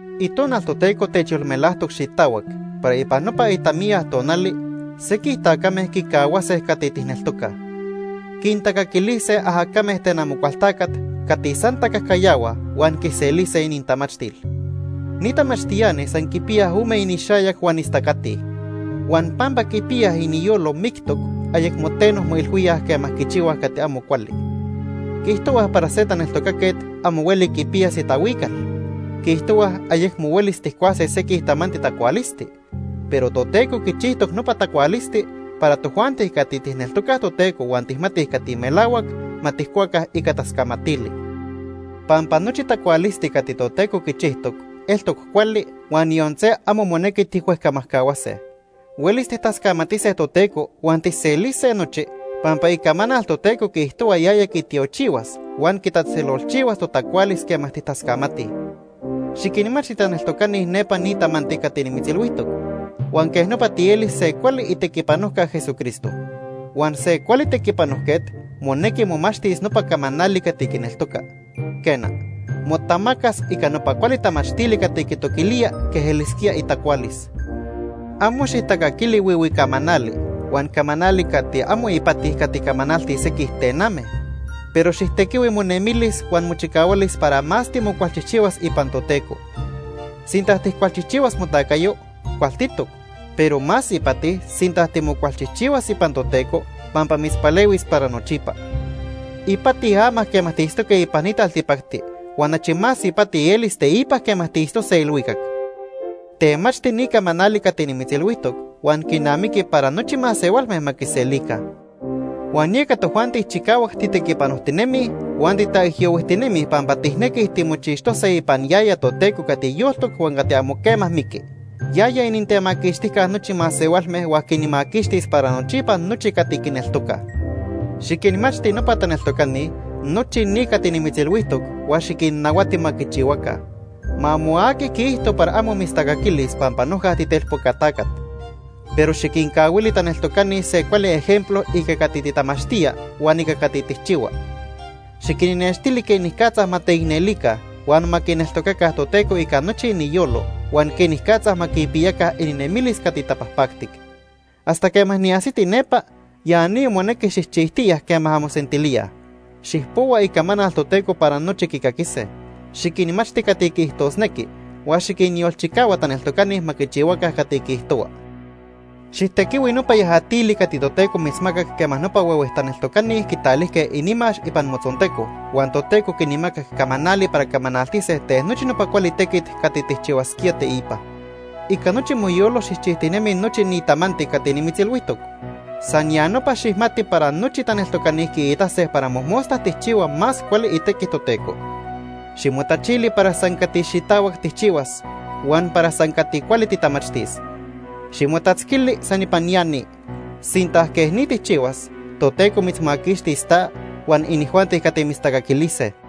Itonal Toteco techyolmelajtoc xitahuac para ipan nopa itamiya tonali sequij tacame quicahuase cati tijneltocaj. Quintacaquilise ajacame ten Amocualtacat cati san tacajcayahuaj huan quiselise inintamachtil. Ni tamachtiani san quipiyaj ome inixayac huan istacatij. Huan pampa quipiyaj iniyolo mictoc, ayecmo teno moilhuíaj quema quichihuaj cati amo cuali. Quiijtohuaj para se taneltocaquet amo hueli quipiyas itahuical. Quiijtohuaj ayecmo huelis tijcuase sequij tamanti tacualisti. Pero Toteco quichijtoc nopa tacualisti para tojuanti cati tijneltocaj Toteco huan tijmatij cati melahuac ma tijcuaca ica tascamatili. Pampa nochi tacualisti cati Toteco quichijtoc eltoc cuali huan yon se amo monequi tijhuejcamajcahuase. Huelis tijtascamatise Toteco huan tijselise nochi, pampa Icamanal Toteco quiijtohua yaya quitiochihuas huan quitatzejtzelolchihuas totacualis quema tijtascamatij. Xiquinmachti taneltocani nepa ni tamanti cati nimitzilhuijtoc, huan quej nopa tielis se cuali itequipanojca Jesucristo. Huan se cuali tequipanojquet monequi momachtis nopa camanali cati quineltoca. Quena, motamacas ica nopa cuali tamachtili cati quitoquilía quej elisquía itacualis. Amo xijtacaquili huihui camanali huan camanali cati amo ipati cati camanaltij sequij tename, pero xijtequihui monemilis huan mochicahualis para más timocualchijchihuas ipan Toteco. Sinta tijcualchijchihuas motacayo, cualtitoc. Pero más ipati sinta timocualchijchihuas ipan Toteco, pampa mitzpalehuis para nochipa. Ipati ama quema tiitztoque ipan ni taltipacti huan achi más ipati elis teipa quema tiitztose ilhuicac. Temachti ni camanali cati nimitzilhuijtoc huan quinamiqui para nochi masehualme ma quiselica. Huan yeca tojuanti chicahuac titequipanojtinemij huan titaijyohuijtinemij pampa tijnequij timochixtose ipan yaya Toteco cati yoltoc huan cati amo quema miqui. Yaya inintemaquixtijca nochi masehualme huan quinmaquixtis para nochipa nochi cati quineltocaj. Xiquinmachti nopa taneltocani nochi ni cati nimitzilhuijtoc huan xiquinnahuati ma quichihuaca. Ma amo aqui quiijto para amo mitztacaquilis pampa noja titelpoca tacat. Pero xiquincahuili taneltocani se cuali ejemplo ica cati titamachtía huan ica cati tijchihua. Xiquinnextili quenicatza ma teicnelica huan ma quineltocaca Toteco ica nochi iniyolo huan quenicatza ma quipiyaca ininemilis cati tapajpactic. Hasta quema niajsiti nepa, ya ni monequi xijchijtiya quema anmosentilíaj: Xijpohua Icamanal Toteco para nochi quicaquise. Xiquinmachti cati quiijtosnequi. Huan xiquinyolchicahua taneltocani ma quichihuaca cati quiijtohua. Xijtequihui nopa yajatili cati Toteco mitzmacac quema nopa huehue taneltocani quitalijque inimax ipan motzonteco huan Toteco quinmacac camanali para camanaltise ten nochi nopa cuali tequit cati tijchihuasquía teipa. Ica nochi moyolo xijchijtinemi nochi ni tamanti cati nimitzilhuijtoc. San ya nopa xijmati para nochi taneltocani quiitase para mojmosta tijchihua más cuali itequi Toteco. Ximotachili para san cati xitahuac tijchihuas huan para san cati cuali titamachtis. Ximotatzquili san ipan ya ni. Sinta quej ni tijchihuas, Toteco mitzmaquixtis ta huan inijuanti cati mitztacaquilise.